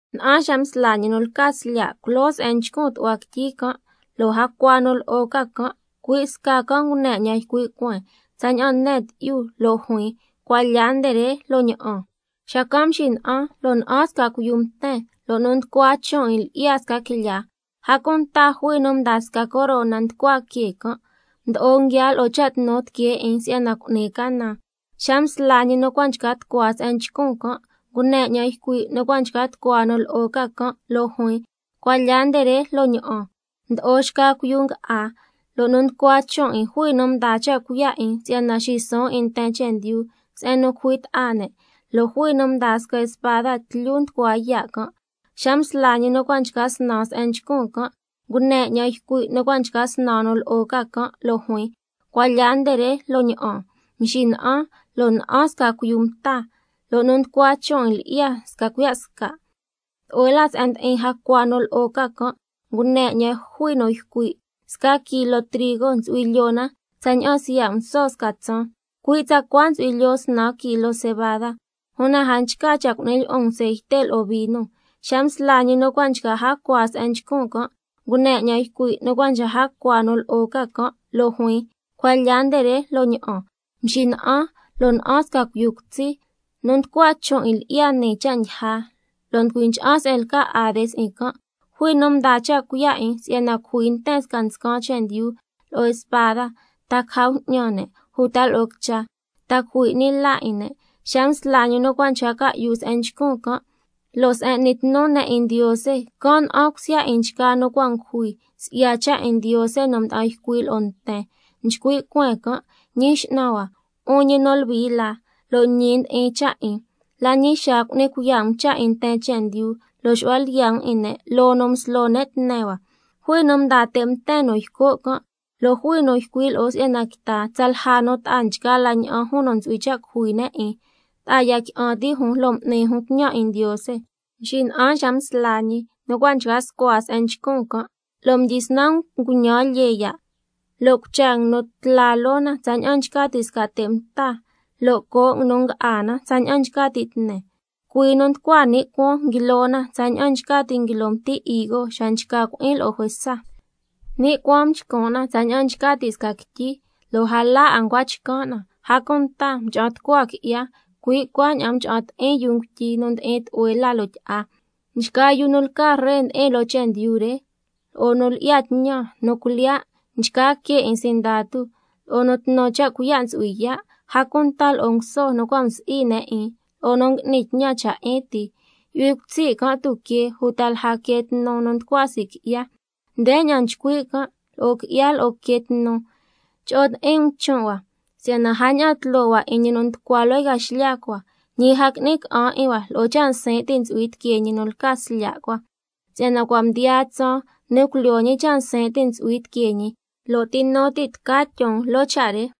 Na'an xa msla ñi nu lca Slya' culoo se'en nchcun tu'hua quityi can', lo' jacua nu lo'o ca can', cui' sca can' ngune 'ñan ycui' cueen tsaña'an ne tyi'yu, lo' juin: Cuan lya nde re lo' ña'an. Xacan' mxina'an lo' na'an sca cuiyu mten, lo' nu nducua chon' 'in lyi'ya sca quilyaa, a cunta jui nu mdaa sca corona nducua que can', mdo'o nguiaa lo'o cha' tnu tiquee 'in si'yana cu'ni canan. Xa msla ñi nu cua' nchca tucua se'en nchcun can', ngune 'ñan ycui' nu cua' nchca tucua nu lo'o ca can', lo' juin: Cuan lya nde re lo' ña'an. Mdo'o xca cuiyu nga'á, lo' nu nducua chon' 'in jui nu mdaa cha' cuiya' 'in si'yana xisuun 'in nten chendyu se'en nu cujui ta'a ne', lo' jui nu mdaa sca spada tlyu nducua yaa' can'. Xa msla ñi nu cua' nchca snan se'en nchcun can', ngune 'ñan ycui' nu cua' nchca snan nu lo'o ca can', lo' juin: Cuan lya nde re lo' ña'an. Mxina'an, lo' na'an sca cuiyu mta, lo' nu nducua chon' 'in lyi'ya sca cuiya' sca'. Tlu'hue la se'en ndi'in jacua nu lo'o ca can', ngune 'ñan jui nu ycui': Sca kilo trigo ntsu'hui lyoo na tsaña'an siya' nguso sca tsaan. Cui' tsacua ntsu'hui lyoo snan kilo cebada. Una a nchca cha' cu'ni lyi'un ceite lo'o vino. Xa msla ñi nu cua' nchca jacua se'en nchcun can', ngune 'ñan ycui' nu cua' nchca jacua nu lo'o ca can', lo' juin: Cuan lya nde re, lo' ña'an. Mxina'an, lo' na'an sca cuiyu cutsi, nu nducua chon' 'in lyi'ya nii Cha' Ndyija, lo' nducui ncha'an se'en lca Hades 'in can'. Jui nu mdaa cha' cuiya' 'in si'yana cujui nten sca nscan chendyu lo'o spada, ta caja bju'ñan ne', uta lo'o quicha, ta cujui 'ni la 'in ne'. Xa msla ñi nu cua' nchca ca'yu se'en nchcun can', lo' se'en n'ni tnu ne' 'in Ndiose, can' na'an cusya 'in nchgaa nu cua' ngujui si'ya cha' 'in Ndiose nu mda'an ycui' lo'o nten. Nchcui' cueen can': Ñi X'nan hua, 'un ñi nu Luhui la, lo' ñi ndi'in cha' 'in, ¿la ñi xaa cu'ni cuiya' um cha' 'in nten chendyu, lo' xu'hua lyiya' um 'in ne' loo nu mslo ne' tne hua? Jui nu mdaa te' mten nu yco' can', lo' jui nu ycui' lo'o si'yana quita tsalja nu ta'a nchgaa la ña'an jun nu ntsu'hui cha' cujui ne' 'in, ta'a ya qui'an ti' jun lo' m'ni jun tñan 'in Ndiose. Mxina'an xa msla ñi nu cua' nchca scua se'en nchcun can', lo' mdyisnan nguñan lyee ya', lo' cucha nguinu tla loo na tsaña'an nchca ti' sca te' mta, lo' coo' nguinu nga'á na tsaña'an nchca ti' tne. Cuii nu nducua ni' cuaan nguilo na tsaña'an nchca ti' nguilo mti higo xa nchca cui'in lo'o juesa. Ni' cuaan mxcun' na tsaña'an nchca ti' sca quityi, lo' a la 'a ncua chcan' na, a cunta mcha'an tucua qui'ya, cui' cuaña'an mcha'an ti'in yuu ngutyi nu ndi'in tlu'hue la loo tyi'a. Nchgaa yu nu lca ree ndi'in loo chendyu re, lo'o nu lyi'ya tñan, nu cuilyiya', nchgaa que 'in sindatu, lo'o nu tnu cha' cuiya' ntsu'hui yaa', a cunta lo'o nguso nu cua' msi'i ne' 'in lo'o nu ngui'ni tñan cha' 'in ti, yu'hui cutsi' can' tuquee uta lja quee tnu nu nducua sii' qui'ya. Ndeña'an nchcui' can' lo'o qui'ya lo'o quee tnu: —Cho'o ti'in um chon' hua—, si'yana a ña'an tloo hua 'in ñi nu nducua loo yca xlya cua, ñi a qui'ni ca'an 'in hua lo'o cha' nsin' ti' nu ntsu'hui tiquee ñi nu lca Slya' cua. Si'yana cua' mdiyaa tsaan nu culyoo ñi cha' nsin' ti' nu ntsu'hui tiquee ñi, ¿lo' ti nu ti' tca tyon loo cha' re?